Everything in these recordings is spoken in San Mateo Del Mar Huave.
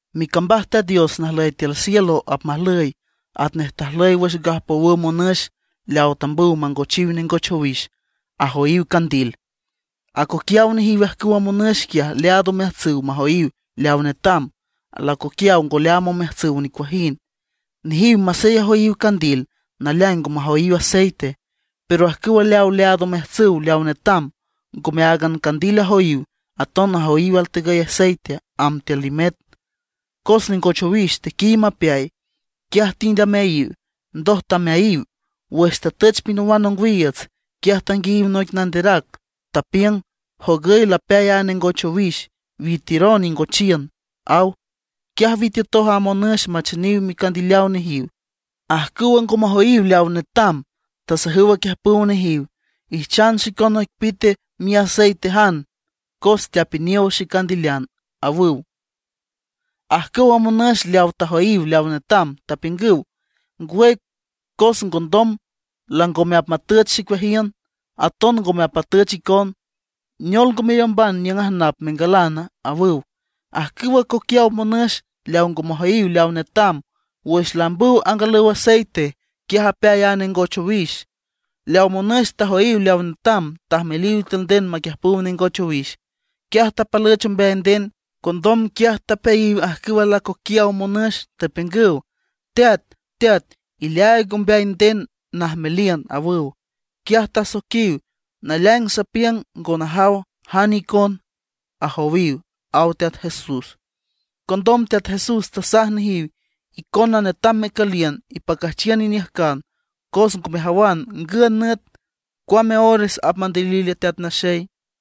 ’Micambaj Teat Dios najlüy tiül cielo apmajlüy atnej tajlüy wüx gajpowüw monüx leaw tambüw mangochiw nengoch owix, ajoyiw candil. Acoquiaw nejiw ajcüwa monüx quiaj leaad omeajtsüw majoyiw leaw netam, alacoquiaw ngo leaam omeajtsüw nicuajind. Nejiw masey ajoyiw candil, naleaing ngo majoyiw aceite. Pero ajcüw leaw leaad omeajtsüw leaw netam, ngome áagan candil ajoyiw, aton tajoyiw altegüy aceite amb tiül limet. Cos nengoch owix tequiy mapeay, quiaj tind ameayiw, ndoj tameayiw. Wüx tatüch pinawan ongwiiüts, quiaj tanguiayiw noic nanderac, tapiüng: “¡Jogüy lapeay a nengoch owix; witiüron ingochiün!” aw. Quiaj witiütoj a monüx macheniw micandileaw nejiw. Ajcüwa ngo majoyiw leaw netam tasajüw aquiüjpüw nejiw: “Ijchan xicon noic pite miaceitejan cos teapiniow xecandilean”, ajüw. Ajcüwa monüx leawa tajoyiw leaw netam tapiüngüw: “Ngwüy cos condom langome apmatüch xicueajiün, aton ngome apmatüch icon. Neol ngo meriümban niüng ajnap mengalan”, awüw. Ajcüwa acoquiaw monüx leaw ngo majoyiw leaw netam, wüx laambüw angalüw aceite, quiaj apeay a nengoch owix. Leaw monüx tajoyiw leaw netam tajmeliw tiül nden maquiüjpüw nengoch owix. Quiaj tapalüch ombeay nden. Condom quiaj tapeayiw ajcüw alacoquiaw monüx, tapiüngüw: “¡Teat, teat, ileaaig ombeay nden najmeliün!” awüw. Quiaj tasoiquiw: “Naleaing sapiüng, ngo najaw jane icon”, ajowiw ―aw Teat Jesús. Condom Teat Jesús tasaj nejiw: ―Icona netam mecüliün ipacüjchiün iniüjcan, cos ngo mejawan ngün nüt, cuame ores apmandilil a Teat Naxey.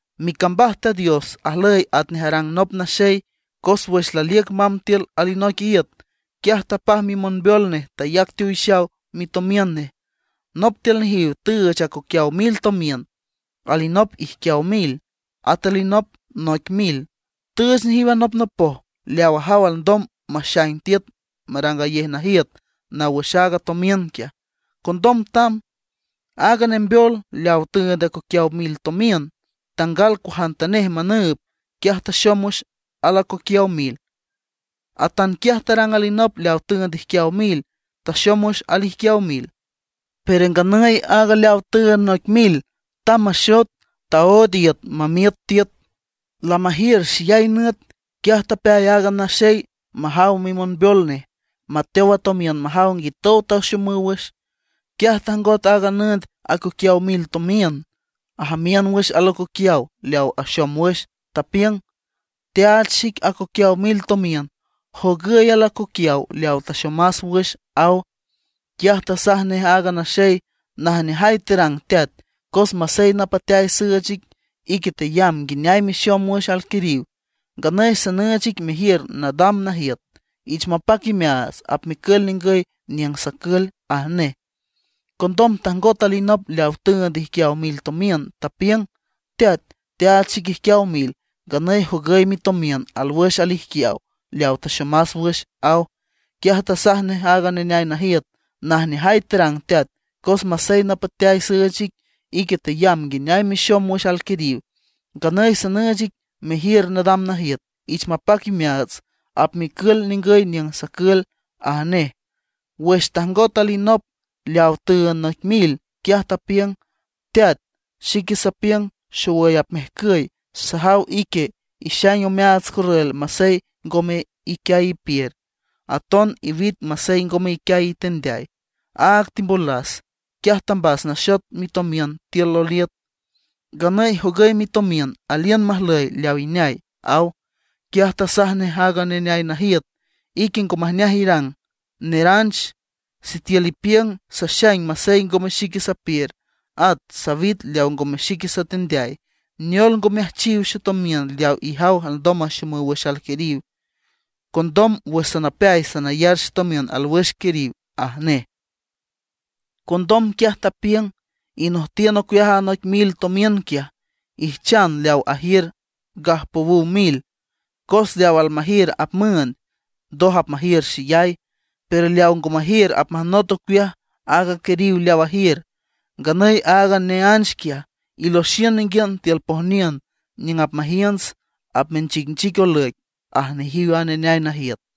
’Micambaj Teat Dios ajlüy atnej tarang nop naxey, cos wüx laliüc mamb tiül alanoic iüt, quiaj tapaj mimonbeol nej, tayac teowixaw mitomiün nej. ’Nop tiül nejiw tüüch acoquiaw mil tomiün, alinop ijquiaw mil, at alinop noic mil. Tüüch nejiw anopnopoj leaw ajaw alndom maxaing tiüt marangayej najiüt naw wüx aaga tomiün quiaj. Condom tamb. Aaga nembeol leaw tüünd acoquiaw mil tomiün tangal cuajantanej manüüb. Quiaj taxom wüx alacoquiaw mil. Atanquiaj tarang alinop leaw tüünd ijquiaw mil; taxom wüx alijquiaw mil. Pero nganüy aaga leaw tüünd noic mil tamb maxot, taood iüt mamiüt tiül. ’Lamajiür xeyay nüt, quiaj tapeay aaga naxey majaw mimonbeol nej, mateow a tomiün majaw nguitow taxomüw wüx. Quiaj tajngot aaga nüünd acoquiaw mil tomiün, ajamiün wüx alacoquiaw leaw axom wüx, tapiüng: “Teaach xic acoquiaw mil tomiün; jogüy alacoquiaw leawa taxomas wüx”, aw. Quiaj tasaj nej aaga naxey: “Najneajay terang teat, cos masey napateay süüch ic, ique teyamb nguineay mexom wüx alquiriw. Nganüy sanüüch ic mejiür nadam najiüt. Ich mapac imeaats, apmecül ningüy niüng sacül”, aj nej. Condom tajngot alinop leaw tüünd ijquiaw mil tomiün, tapiüng: “Teat, teaach xic ijquiaw mil. Nganüy jogüy mitomiün, alwüx alijquiaw leaw taxomas wüx”, aw. Quiaj tasaj nej aaga neneay najiüt: “Najneajay terang teat, cos masey napateay süüch ic, ique teyamb nguineay mexom wüx alquiriw. Nganüy sanüüch ic mejiür nadam najiüt. Ich mapac imeaats, apmecül ningüy niüng sacül”, aj nej. Wüx tajngot alinop leaw tüünd noic mil, quiaj tapiüng: “Teat, xique sapiüng xowüy apmejcüy. Sajaw ique ixaing omeaats corrül masey ngome iquiay ipiür, aton iwit masey ngome iquiay itendeay. Áag timbolas, quiaj tambas naxot mitomiün tiül loliüt. Nganüy jogüy mitomiün, aliün majlüy leaw ineay”, aw. Quiaj tasaj nej aaga neneay najiüt: “Ique ngo majneaj irang, neranch. Sitiül ipiüng saxaing masey ngome xique sapiür, at sawit leaw ngome xique satendeay; neol ngo meajchiw xetomiün leaw ijaw alndom maxomüw wüx alquiriw, condom wüx sanapeay sanayar xetomiün alwüx quiriw”, aj nej. Condom quiaj tapiüng: “Inojtiün ocueaj a noic mil tomiün quiaj, ijchan leaw ajiür gajpowüw mil. Cos leaw almajiür apmüünd, ndoj apmajiür xeyay; pero leaw ngo majiür apmajnot ocueaj aaga quiriw leaw ajiür. Nganüy aaga neánch quiaj, iloxiün ninguiün tiül pojniün, niüng apmajiünts, apmenchicnchic olüic”, aj nejiw a neneay najiüt.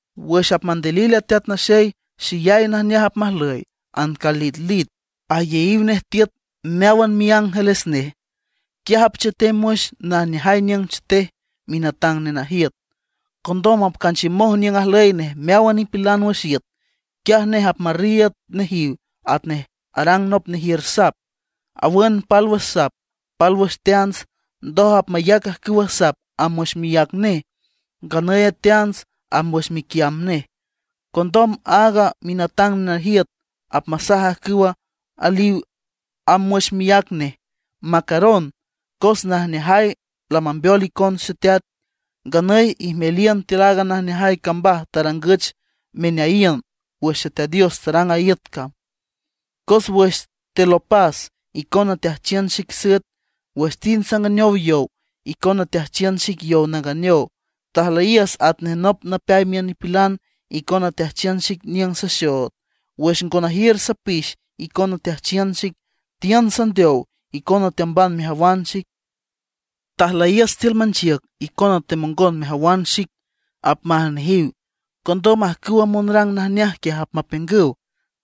’Wüx apmandilil a Teat Naxey, xeyay najneajay apmajlüy; ancalitlit, ayeyiw nej tiüt meáwan miángeles nej. Quiaj apchetem wüx najneajay niüng chetej minatang nenajiüt. Condom apcanchiümoj niüng ajlüy nej meáwan nipilan wüx iüt. Quiaj nej apmarriiüd nejiw atnej arang nop nejiür sap, awün pálwüx sap, pálwüx teants. Ndoj apmayac ajcüwa sap amb wüx miác nej, nganüy a teants amb wüx miquiamb nej. Condom aaga minatang nenajiüt apmasaj ajcüw ajlüyiw amb wüx miác nej: “Macaron, cos najneajay lamambeol icon Xeteat. Nganüy ijmeliün tiül aaga najneajay cambaj tarangüch meneayiün wüx Xeteat Dios tarang a iüt cam. Cos wüx telopas, icona teajchiün xic süet; wüx tind sanganeow yow, icona teajchiün xic yow nanganeow. Tajlüyiüs atnej nop napeay miün nipilan, icona teajchiün xic niüng saxood. Wüx ngo najiür sapix icona teajchiün xic; tiün sandeow, icona teamban mejawan xic. Tajlüyiüs tiül manchiüc icona temongon mejawan xic”, apmaj nejiw. Condom ajcüwa monrang najneaj quiaj apmapiüngüw: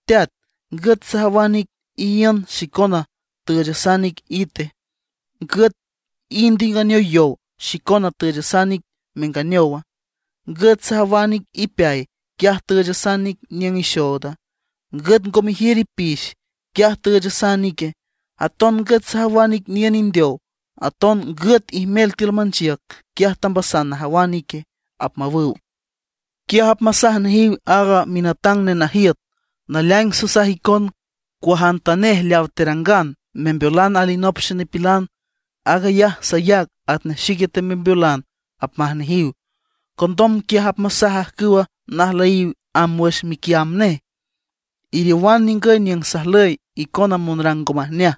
“¡Teat! ¿Ngüt sajawan ic iíünd, xicona tüüchasan ic ite? ¿Ngüt tind inganeow yow, xicona tüüchasan ic menganeowa? ¿Ngüt sajawan ic ipeay, quiaj tüüchasan ic niüng ixooda? ¿Ngüt ngo mejiür ipix, quiaj tüüchasan ique? ¿Aton ngüt sajawan ic niün indeow, aton ngüt ijmel tiül manchiüc, quiaj tambasan najawan ique?” apmawüw. Quiaj apmasaj nejiw aaga minatang monajiüt: “Naleaing sasaj icon, cuajantanej leaw terangan membeolan alinop xenipilan, aag ayaj sayac atnej xique temembeolan”, apmaj nejiw. ’Condom quiaj apmasaj ajcüwa najlüyiw amb wüx miquiamb nej: “Iriowan ningüy niüng sajlüy, icona monrang ngo majneaj.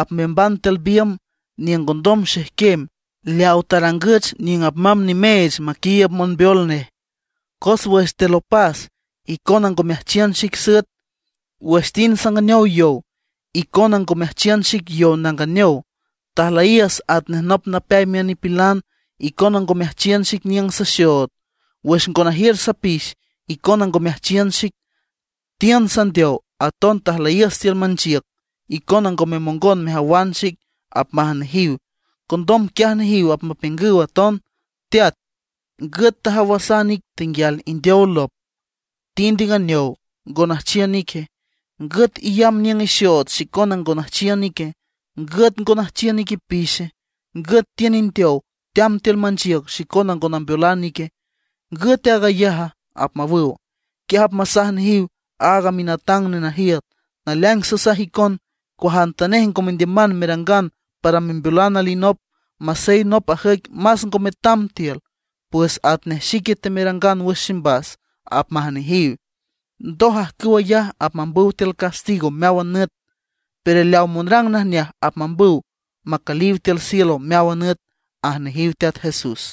Apmeamban tiül biümb niüng ngondom xejquem, leaw tarangüch niüng apmamb nimeech maquiiüb monbeol nej. Cos wüx telopas, icona ngo meajchiün xic süet, wüx tind sanganeow yow, icona ngo meajchiün xic yow nanganeow. Tajlüyiüs atnej nop napeay miün nipilan, icona ngo meajchiün xic niüng saxood. Wüx ngo najiür sapix icona ngo meajchiün xic. Tiün sandeow, aton tajlüyiüs tiül manchiüc, icona ngo memongon mejawan xic”, apmaj nejiw. Condom quiaj nejiw apmapiüngüw aton: “Teat, ¿ngüt tajawasan ic tenguial indeow lop, tind inganeow, ngo nüjchiün ique? ¿Ngüt iyamb niüng ixood xicona ngo nüjchiün ique? ¿Ngüt ngo nüjchiün ic ipixe? ¿Ngüt tiün indeow, teamb tiül manchiüc, xicona ngo nambeolan ique? ¿Ngüt aag ayaja?” apmawüw. Quiaj apmasaj nejiw aaga minatang nenajiüt: “Naleaing sasaj icon, cuajantanej ngo mendiüman merangan para membeolan alinop, masey nop ajüic más ngo metam tiül, pues atnej xique temerangan wüx ximbas”, apmaj nejiw. Ndoj ajcüw ayaj apmambüw tiül castigo meáwan nüt, pero leaw monrang najneaj apmambüw macüliw tiül cielo meáwan nüt ―aj nejiw Teat Jesús.